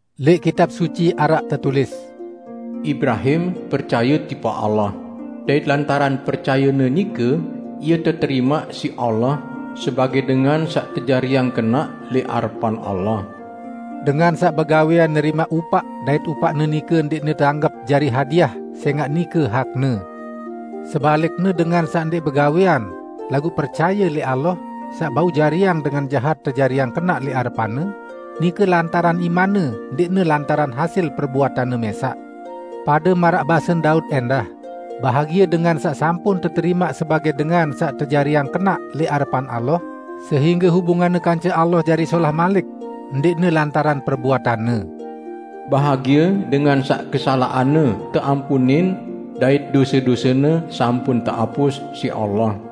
Lẽq Kitab Suci araq tetulis, "Ibrahim percaye tipaq Allah, dait lantaran percayene nike ie teterimaq siq Allah sebagẽ dengan saq tejariang kenaq lẽq arepan Allah." Dengan saq begawẽan nerimaq upaq dait upaqne nike ndẽqne teanggep jari hadiah sẽngaq nike hakne. Sebalikne dengan saq ndẽq begawẽan laguq percaye lẽq Allah saq bau jariang dengan jahat tejariang kenaq lẽq arepan-Ne, nike lantaran imanne ndẽqne lantaran hasil perbuatanne mẽsaq. Pade maraq basen Daud ẽndah, bahagie dengan saq sampun teterimaq sebagẽ dengan saq tejariang kenaq lẽq arepan Allah sehingge hubunganne kance Allah jari solah malik, ndẽqne lantaran perbuatanne, "Bahagie dengan saq kesalaqanne teampunin dait dose-dosene sampun teapus siq Allah!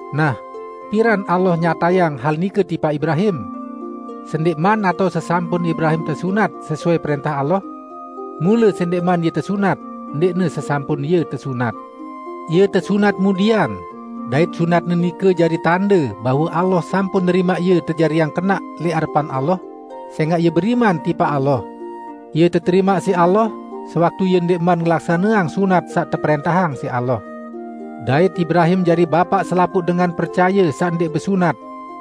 Nah, piran Allah nyatayang hal nike tipaq Ibrahim? Sendẽqman atao sesampun Ibrahim tesunat sesuai prẽntah Allah? Mule sendẽqman ie tesunat, ndẽqne sesampun ie tesunat. Ie tesunat mudian, dait sunatne nike jari tande bahwe Allah sampun nerimaq ie tejariang kenaq lẽq arepan Allah, sẽngaq ie beriman tipaq Allah. Ie teterimaq siq Allah sewaktu ie ndẽqman ngelaksaneang sunat saq teprẽntahang siq Allah. Dait Ibrahim jari bapaq selapuq dengan percaye saq ndẽq besunat,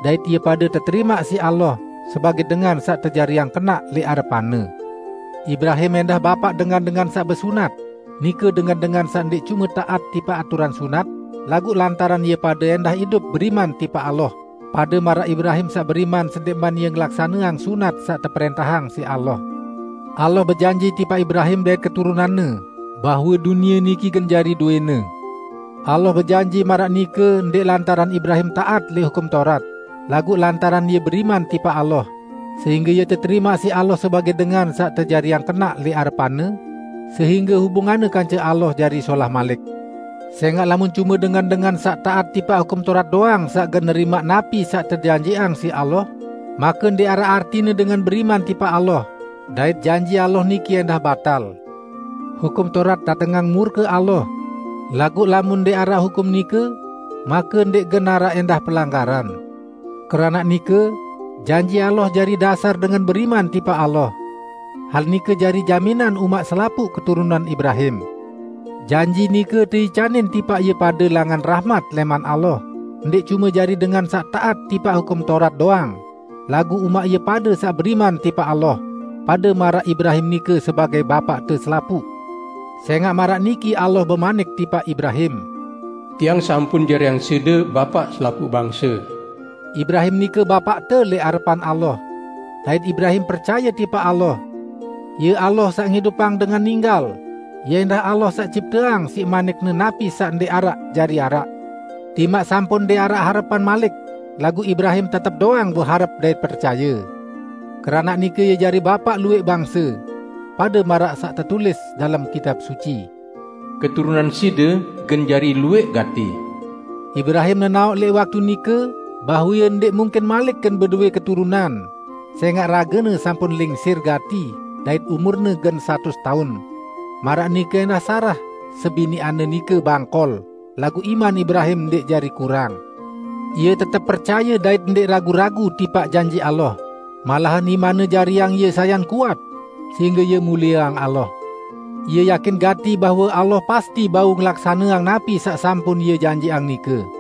dait ie pade teterimaq siq Allah sebagẽ dengan saq tejariang kenaq lẽq arepan-Ne. Ibrahim ẽndah bapaq dengan-dengan saq besunat, nike dengan-dengan saq ndẽq cume taat tipaq aturan sunat, laguq lantaran ie pade ẽndah idup beriman tipaq Allah, pade maraq Ibrahim saq beriman sendẽqman ie ngelaksaneang sunat saq teprẽntahang siq Allah. Allah bejanji tipaq Ibrahim dait keturunanne bahwe dunie niki gen jari dowẽne. Allah bejanji maraq nike ndẽq lantaran Ibrahim taat lẽq Hukum Taurat, laguq lantaran ie beriman tipaq Allah sehingge ie teterimaq siq Allah sebagẽ dengan saq tejariang kenaq lẽq arepan-Ne sehingge hubunganne kance Allah jari solah malik. Sẽngaq lamun cume dengan-dengan saq taat tipaq Hukum Taurat doang saq gen nerimaq napi saq tejanjiqang siq Allah, make ndẽq araq artine dengan beriman tipaq Allah, dait janji Allah niki ẽndah batal. Hukum Taurat datengang murke Allah, laguq lamun ndẽq araq hukum nike make ndẽq gen araq ẽndah pelanggaran. Keranaq nike, janji Allah jari dasar dengan beriman tipaq Allah. Hal nike jari jaminan umaq selapuq keturunan Ibrahim. Janji nike teicanin tipaq ie pade langan rahmat lẽman Allah, ndẽq cume jari dengan saq taat tipaq Hukum Taurat doang, laguq umaq ie pade saq beriman tipaq Allah, pade maraq Ibrahim nike sebagẽ bapaqte selapuq. Sẽngaq maraq niki Allah bemanik tipaq Ibrahim, "Tiang sampun jariang side umaq selapuq bangse." Ibrahim nike bapaqte lẽq arepan Allah. Dait Ibrahim percaye tipaq Allah. Ie Allah saq ngidupang dengan ninggal, Ie ẽndah Allah saq cipteang siq manik-Ne napi saq ndẽq araq jari araq. Timaq sampun ndẽq araq harepan malik, laguq Ibrahim tetep doang beharep dait percaye. Keranaq nike ie jari bapaq luwẽq bangse. Pade maraq saq tetulis dalem Kitab Suci, "Keturunan side gen jari luwẽq gati." Ibrahim nenaoq lẽq waktu nike bahwe ie ndẽq mungkin malik gen bedowẽ keturunan, sẽngaq ragene sampun lingsir gati dait umurne gen satus taun; maraq nike ẽndah Sarah, sebiniqanne nike bangkol, laguq iman Ibrahim ndẽq jari kurang. Ie tetep percaye dait ndẽq ragu-ragu tipaq janji Allah, malahan imanne jariang ie sayan kuat -- sehingge ie mulieang Allah. Ie yakin gati bahwe Allah pasti bau ngelaksaneang napi saq sampun Ie janjiqang nike.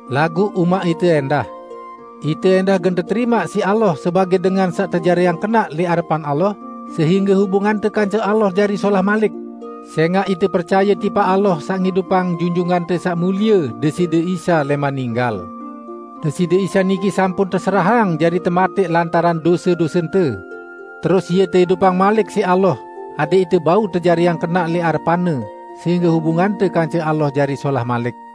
laguq umaq ite ẽndah. Ite ẽndah gen teterimaq siq Allah sebagẽ dengan saq tejariang kenaq lẽq arepan Allah sehingge hubungante kance Allah jari solah malik, sẽngaq ite percaye tipaq Allah saq ngidupang Junjungante Saq Mulie Deside Isa lẽman ninggal. Deside Isa niki sampun teserahang jari tematẽq lantaran dose-dosente; terus Ie teidupang malik siq Allah adẽq ite bau tejariang kenaq lẽq arepan-Ne sehingge hubungante kance Allah jari solah malik.